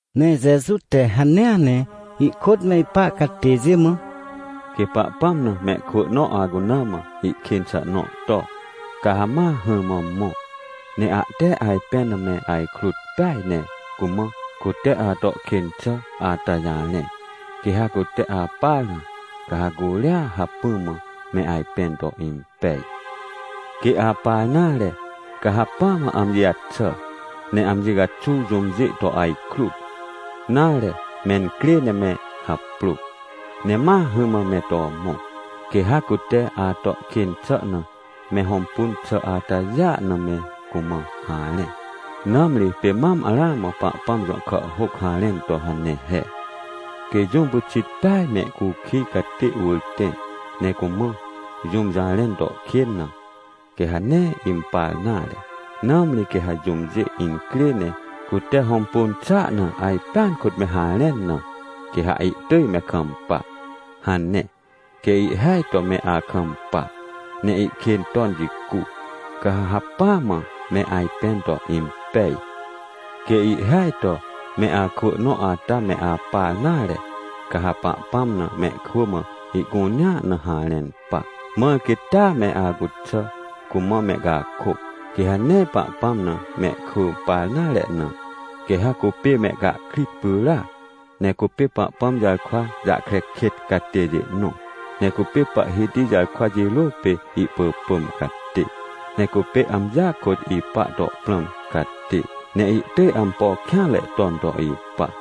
Ne Jeju te hanea ne ihkôt me ipa catêjê mã: — Quê Pahpãm na mehkwỳ nõ acuna mã ihkên xà nõ to, ca ha ma hỹrmã mõ, ne ahte ajpẽn na me ajkrut peaj ne cumã cute ato kên xà ata jarẽ. Quê ha cute apar na, ca ha curia hacpỹ mã me ajpẽn to impej. — Quê apar nare, ca hacpỹa mã amji jaxà ne amji caxuw jũmjê to ajkrut, nare, mencrê ne me haprô, ne ma hỹrmã me to mõ. Quê ha cute ato kên xà na me hõmpun xà atajêa na me cumã harẽ. Nãmri pê mam ramã Pahpãm jõ kàhhôc harẽn to hane he: “Quê jũm pyxit peaj mehcukij catê wỳr tẽ, ne cumã jũm jarẽn to kên na, quê ha nee impar nare, nãmri quê ha jũmjê incrê ne cute hõmpun xàa na ajpẽan kôt me harẽn na, quê ha ihtỳj me kampa” hane. Quê ihhêaj to me akampa ne ihkên ton jicu, ca ha hacpỹa mã me ajpẽn to impej. — Quê ihhêaj to me akwỳ nõ ata me apar nare, ca ha Pahpãm na mehkwỳ mã ihcunea na harẽn pa, mãr quê taa me acuxà cumã mehcakôc. Quê ha nee Pahpãm na mehkwỳ par nare na, quê ha cupê mehcahkrit pyràc, ne cupê Pahpãm jarkwa jahkre kêt catêjê nõ, ne cupê Pahhiti jarkwa jirô pê ihpỳpỳm catê. Ne cupê amjia kôt ipa to prãm catê, ne ihtỳj ampo kêanre ton to ipa.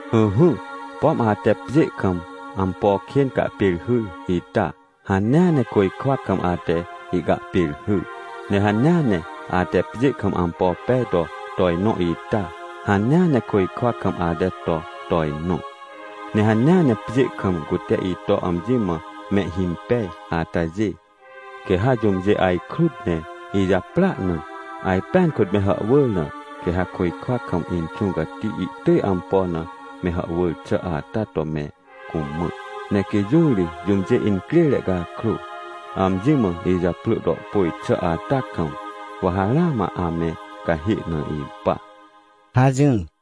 — Ỹhỹ, pom ate pjê kam ampo kên cahpêrhyr ita, hanea ne côjkwa kam ate ihcahpêrhyr. Ne hanea ne ate pjê kam ampo pej to tojnõ ita, hanea ne côjkwa kam ate to tojnõ. — Ne hanea ne pjê kam cute ito amji mã mehhimpej atajê, quê ha jũmjê ajkrut ne ijaprỳa na, ajpẽan kôt me hàhwỳr na, quê ha côjkwa kam Inxũ Cati ihtỳj ampo na me hàhwỳr xà ata to me cumã. Ne quê jũ ri jũmjê incrêre cakrô, amji mã ijaprỳ to pôj xà ata kam, wa ha ramã ame cahê na ipa — hajỹr.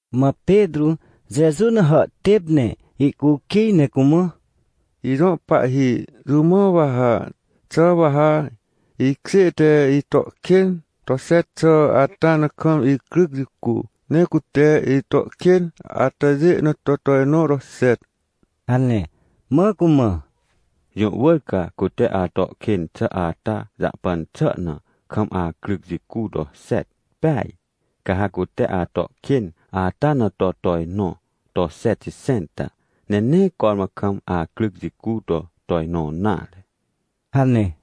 Mã Petrô Jeju na hàhtêp ne ihcukij ne cumã: — Ijõ Pahhi, jũ mã wa ha? Xà wa ha ikjê te ito kên to xet xà ata na kam icryc jicu, ne cute ito kên atajê na to tojnõ to xet? — hane. Mã cumã: — Jũ wỳr ca cute ato kên xà ata jahpan xà na, kam acryc jicu to xet peaj. Ca ha cute ato kên ata na to tojnõ to xetxẽnta, ne nee cormã kam acryc jicu to tojnõ nare — hane.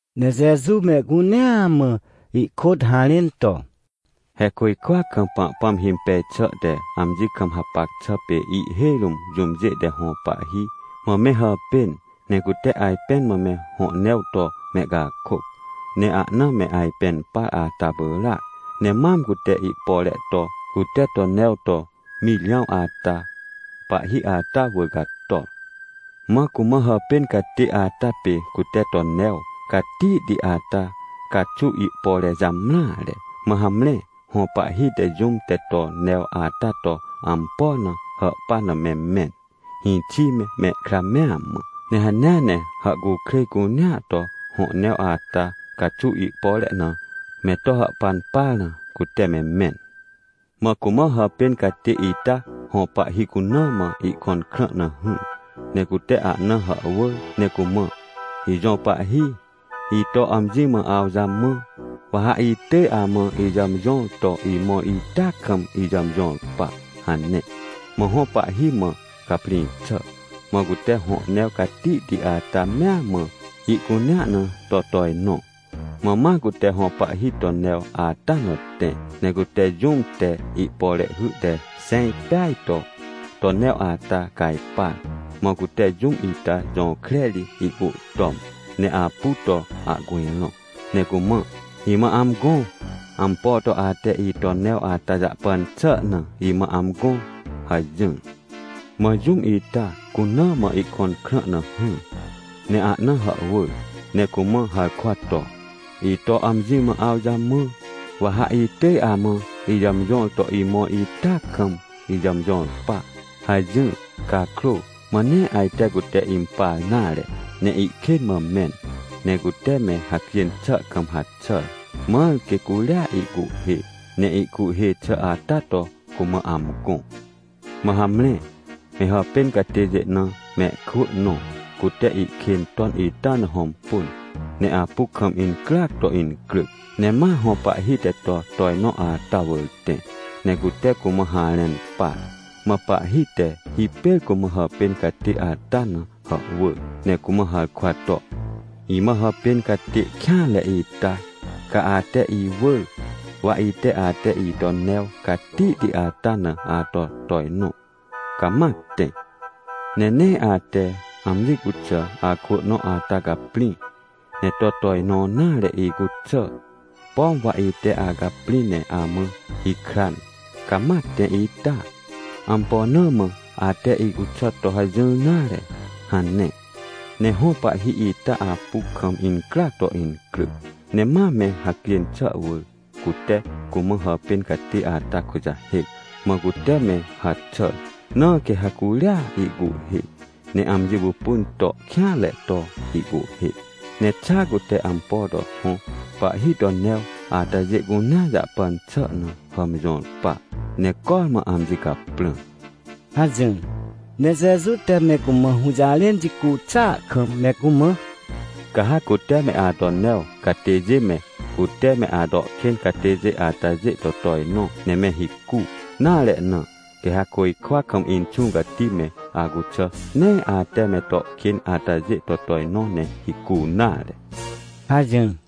Ne Jeju mehcunea mã ihkôt harẽn to: — He côjkwa kam Pahpãm himpej xà te amji kam hapac xà pê ihhêj rũm jũmjê te hõ pahhi mã me hàpên, ne cute ajpẽn mã me hõ new to mehcakôc, ne ahna me ajpẽn par ata pyràac. Ne mam cute ihpore to, cute to new to mirjãw ata, pahhi ata wỳr cator. Mã cumã hàpên catê ata pê cute to new catihti ata caxuw ihpore jamreare. Mã hamre, hõ pahhi te jũm te to new ata to ampo na hàhpan na me mẽn, hĩxi me mehkra mea mã. Ne hanea ne hàhcukrêj cunea to hõ new ata caxuw ihpore na me to hàhpan par na, cute me mẽn. — Mã cumã hàpên catê ita hõ pahhi cuna mã ihkõn krã na hỹr, ne cute ahna hàhwỳr ne cumã: — “Ijõ pahhi, ito amji mã awjamã, wa ha itỳj amã ijàmjõr to imõr ita kam ijàmjõr pa!” hane. Mã hõ pahhi mã caprĩ xà, mã cute hõ new catihti ata mea mã, ihcunea na to tojnõ. — Mã ma cute hõ pahhi to new ata na tẽ. Ne cute jũm te ihpore hy te xẽj peaj to, to new ata cajpar. Mã cute jũm ita jõkre ri ihcuhtom, ne apu to ahcujrõ ne cumã: — “Imã amgõ! Ampo to ate ito new ata jahpan xà na imã amgõ!” hajỹr. — Mã jũm ita cuna mã ihkõn krã na hỹr, ne ahna hàhwỳr, ne cumã harkwa to: — “Ito amji mã awjamã, wa ha itỳj amã ijàmjõr to imõr ita kam ijàmjõr pa!” hajỹr. — Cakrô, mã nee ajte cute impar nare, ne ihkên mã mẽn. Ne cute me hacjên xà kam haxàr, mãr quê curia ihcuhhê, ne ihcuhhê xà ata to cumã amgõ. — Mã hamre, me hàpên catêjê na mehkwỳ nõ, cute ihkên ton ita na hõmpun, ne apu kam incryac to incryc, ne ma hõ pahhi te to tojnõ ata wỳr tẽ, ne cute cumã harẽn par. — Mã pahhi te hipêr cumã hàpên catê ata na hàhwỳr ne cumã harkwa to: — “Imã hàpên catê kêanre ita! Ca ate iwỳr, wa ite ate ito new catihti ata na ato tojnõ, ca ma tẽ. Ne nee ate amji cuxà akwỳ nõ ata caprĩ, ne to tojnõ nare icuxà, pom wa ite acaprĩ ne amã hikran, ca ma tẽ ita? Ampo na mã ate icuxà to hajỹr nare?” hane. Ne hõ pahhi ita apu kam incryac to incryc, ne ma me hacjên xà wỳr cute cumã hàpên catê ata kujahêc, mã cute me haxàr. Na quê ha curia ihcuhhê, ne amji pupun to kêanre to ihcuhhê, ne xa cute ampo to hõ pahhi to new atajê cunea jahpan xà na hàmjõr pa, ne cormã amji caprã — hajỹr. Ne Jeju te me cumã hũjarẽn jicu xàa kam me cumã: — Ca ha cute me ato new catêjê me, cute me ato kên catêjê atajê to tojnõ ne me hicu nare na, quê ha côjkwa kam Inxũ Cati me acuxà nee ate me to kên atajê to tojnõ ne hicu nare — hajỹr.